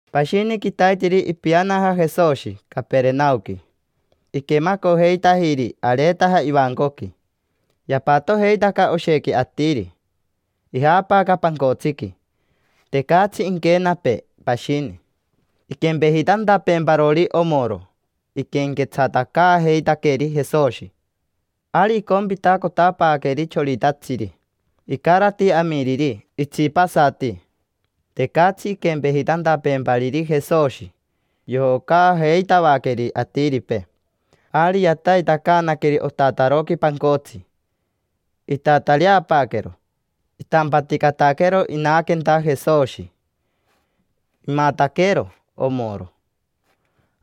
Pashini quitaiteri ipianaja Jesoshi Caperenaoqui. Iquemacojeitajiri areetaja ivancoqui. Yapatojeitaca oshequi atiri, ijaapaaca pancotsiqui. Tecatsi inquenapee pashini inquempejitantapeemparori omoro. Iquenquetsatacaajeitaqueri Jesoshi. Ari icompitacotapaaqueri choritatsiri. Icarati amiriri itsipasati. Tecatsi inquempejitantapeempariri Jesoshi, yojocaajeitavaqueri atiripee. Ari yataitacaanaqueri otataroqui pancotsi. Itatareapaaquero, itampaticataquero inaquenta Jesoshi. Imataquero omoro,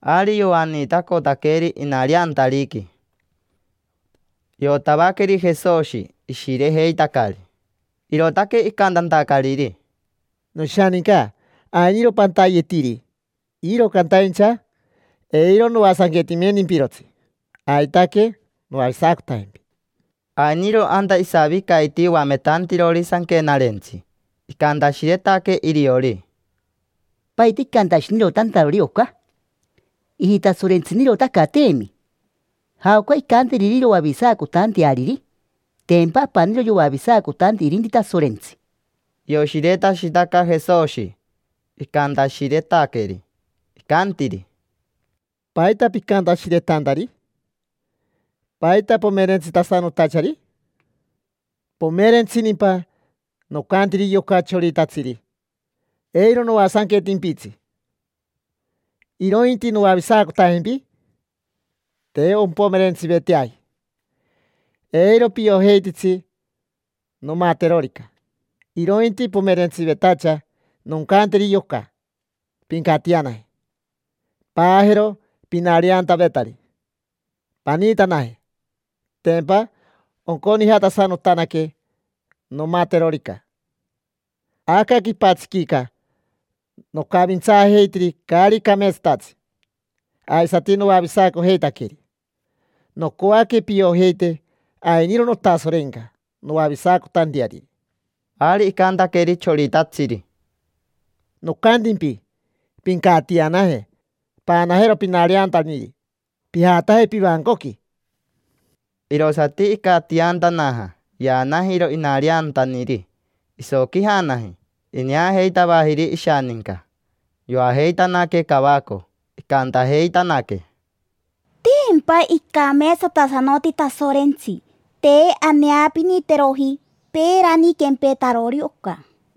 ari yoaniitacotaqueri inareantariqui. Iotavaqueri Jesoshi ishirejeitacari, irootaque icantantacariri: —Noshaninca, ainiro pantayetiri, iro cantaincha eiro noasanquetimentimpirotsi, aitaque noavisacotajempi. Ainiro anta isavicaiti oametantirori sanquenarentsi. Icantashiretaque iriori: —¿Paita icantashinirotantarori oca? Ijitasorentsinirotacateemi. ¿Jaoca incanteriri iroavisacotanteariri? Tempa apaniro yoavisacotanti irinti Tasorentsi. Ioshiretashitaca Jesoshi icantashiretaqueri, icantiri: —¿Paita picantashiretantari? ¿Paita pomerentsitasanotachari? ¿Pomerentsinimpa nocantiriri yoca choritatsiri: “Eiro noasanquetimpitsi, irointi noavisacotajempi”? Te ompomerentsiveteaji: eiro piojeititsi nomaterorica. Irointi pomerentsivetacha noncanteri yoca: “Pincatianaje, paajero pinariantavetari, paniitanaje”. Tempa onconijatasanotanaque nomaterorica. Aca quipatsiquica nocavintsaajeitiri caari cameetsatatsi, aisati noavisacojeitaqueri. Nocoaque piojeite ainiro notasorenca noavisacotanteariri. Ari icantaqueri choritatsiri: —Nocantimpi, pincatianaje, paanajero pinariantaniri, pijataje pivancoqui. Irosati icatiantanaja, yaanajiro inariantaniri, isoquijanaji. Ineajeitavajiri ishaninca, yoajeitanaque cavaco. Icantajeitanaque: —Tempa icameetsatasanoti Tasorentsi, te aneapiniteroji peerani quempetarori oca.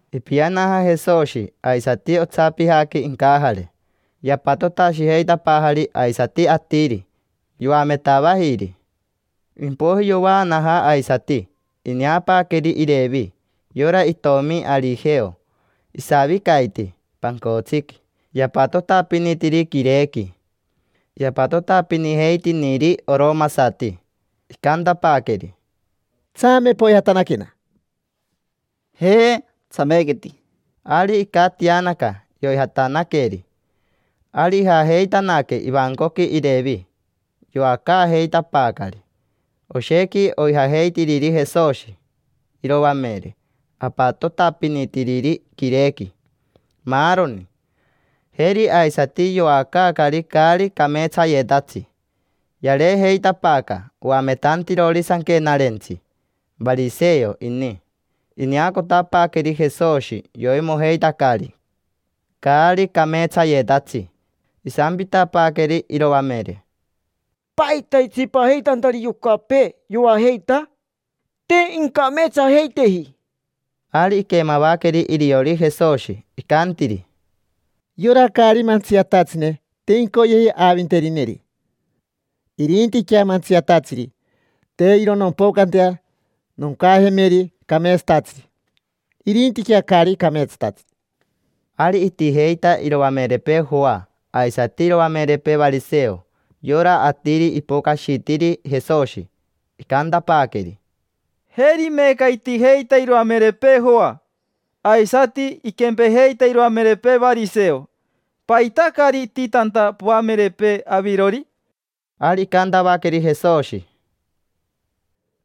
Ipianaja Jesoshi aisati otsapijaqui incajare. Yapatotashijeitapaajari aisati atiri, yoametavajiri. Impoiji yovaanaja aisati. Ineapaaqueri Irevi, yora itomi Arijeo, isavicaiti pancotsiqui yapatotapinitiri quirequi: yapatotapinijeitiniri oromasati. Icantapaaqueri: —Tsame, poijatanaquena. —Ja, tsamequeti. Ari icatianaca, yoijatanaqueri. Ari ijajeitanaque ivancoqui Irevi. Yoacaajeitapaacari oshequi oijajeitiriri Jesoshi, iroamere, apatotapinitiriri quirequi, maaroni. Jeri aisati yoacaacari caari cameetsayetatsi. Yareejeitapaaca oametantirori sanquenarentsi, variseo ini. Ineacotapaaqueri Jesoshi yoimojeitacari caari cameetsayetatsi. Isampitapaaqueri iroamere: —¿Paita itsipajeitantariri yocapee, yoajeita? Te incameetsajeiteji. Ari iquemavaqueri iriori Jesoshi, icantiri: —Yora caari mantsiatatsine te incoyeji aavinterineri, irintiquea mantsiatatsiri. Te iro nompocantea noncajemeri cameetsatatsiri, irintiquea caari cameetsatatsi. Ari itijeita iroamerepee Joa aisati iroamerepee variseo. Yora atiri ipocashitiri Jesoshi, icantapaaqueri: —Jeri meeca itijeita iroamerepee Joa, aisati iquempejeita iroamerepee variseo. ¿Paita caari ititanta poamerepee avirori? Ari icantavaqueri Jesoshi: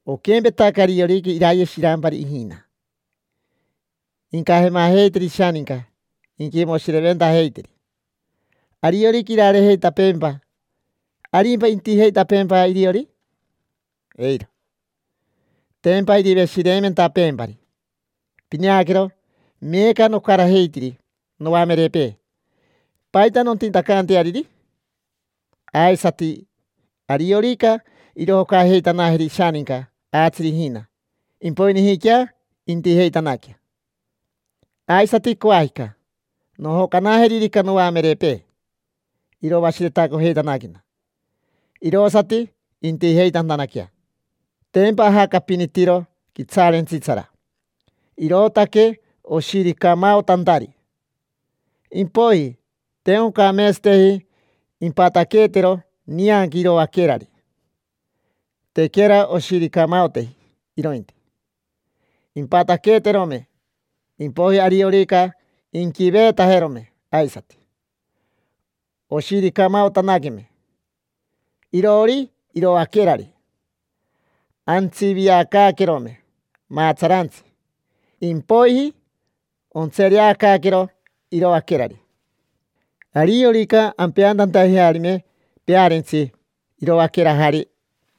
—Oquempetaca ariorica iraye shirampari ijina, incajemajeiteri ishaninca inquimoshireventajeiteri. Ariorica irareejeitapeempa, ¿arimpa intijeitapeempa iriori? Eiro. Tempa iriveshireimentapeempari. Pineaquero, meeca nocarajeitiri noamerepee: ¿paita nontitacanteariri? Aisati, ariorica irojocajeitanajeri ishaninca aatsiri ijina, impoijiniquea intijeitanaquea. Aisati coajica, nojocanajeririca noamerepee, iroashiretacojeitanaquena, irosati intijeitantanaquea. Tempa ajacapinitiro quitsaarentsitsara, irootaque oshiricamaotantari. Impoiji, te oncameetsateji impataqueetero nianqui iroaquerari: tequera oshiricamaoteji irointi. Impataqueeterome, impoiji ariorica inquiveetajerome aisati, oshiricamaotanaqueme iroori iroaquerari, antsiviacaaquerome maatsarantsi. Impoiji ontsereacaaquero iroaquerari. Ariorica ampeantantajearime pearentsi iroaquerajari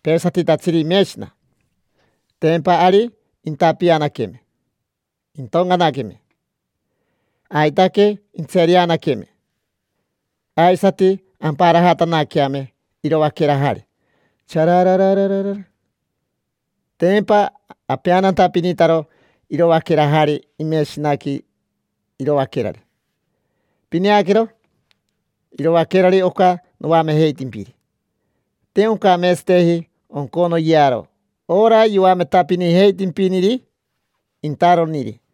peesatitatsiri imeshina, tempa ari intapianaqueame, intoncanaqueme. Aitaque intsereanaqueme, aisati amparajatanaqueame iroaquerajari, chararara. Tempa apeantantapinitaro iroaquerajari imeshinaqui iroaquerari. Pineaquero: iroaquerari oca noamejeitimpiri, te oncameetsateji onconoyearo ora yoametapinijeitimpiniri intaroniri.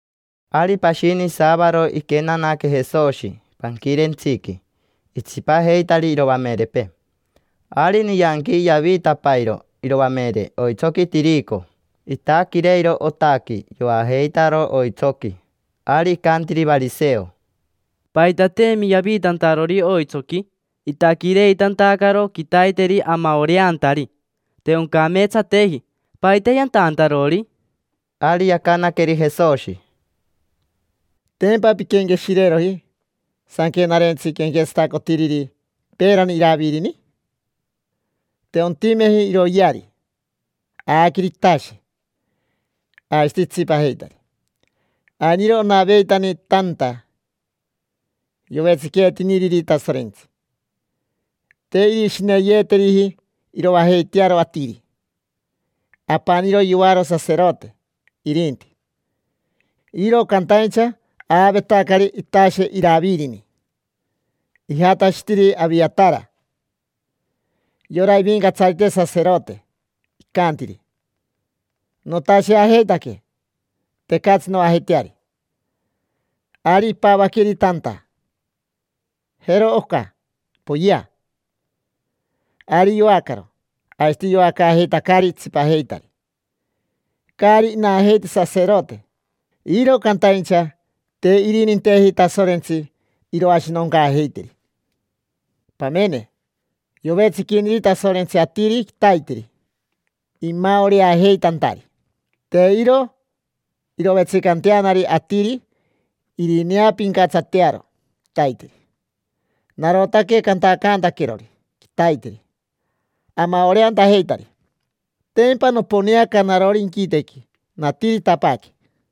Ari pashini saavaro iquenanaque Jesoshi panquirentsiqui, itsipajeitari iroamerepee. Ari nianqui yaviitapairo iroamere oitsoqui tirico, itaquireiro otaqui, yoajeitaro oitsoqui. Ari icantiri variseo: —Paitateemi yaviitantarori oitsoqui, itaquireitantacaro quitaiteri amaoreantari. Te oncameetsateji. ¿Paita yantantarori? Ari yacanaqueri Jesoshi: —¿Tempa pinquenqueshireeroji sanquenarentsi quenquetsatacotiriri peerani Iravirini? Te ontimeji iroyeari, aaqueri itashe, aisati itsipajeitari. Ainiro onaveitani tanta yovetsiqueetiniriri Tasorentsi: te irishineyeeteriji iroajeitearo atiri, apaniro yoaro saserote, irinti. Iro cantaincha aavetacari itashe Iravirini. Ijatashitiri Aviatara, yora ivincatsarite saserote, icantiri: “Notasheajeitaque. Tecatsi noajeiteari”. Ari ipavaqueri tanta: “Jero oca, poyea”. Ari yoacaro, aisati yoacaajeitacari itsipajeitari. Caari inajeiti saserote, iro cantaincha te irininteji Tasorentsi iroashinoncaajeiteri. Pamene, yovetsiquiniri Tasorentsi atiri quitaiteri imaoreajeitantari. Te iro irovetsicanteanari atiri irineapincatsatearo quitaiteri. Narotaque cantacaantaquerori quitaiteri amaoreantajeitari: tempa noponeaca narori inquitequi, natiritapaaque.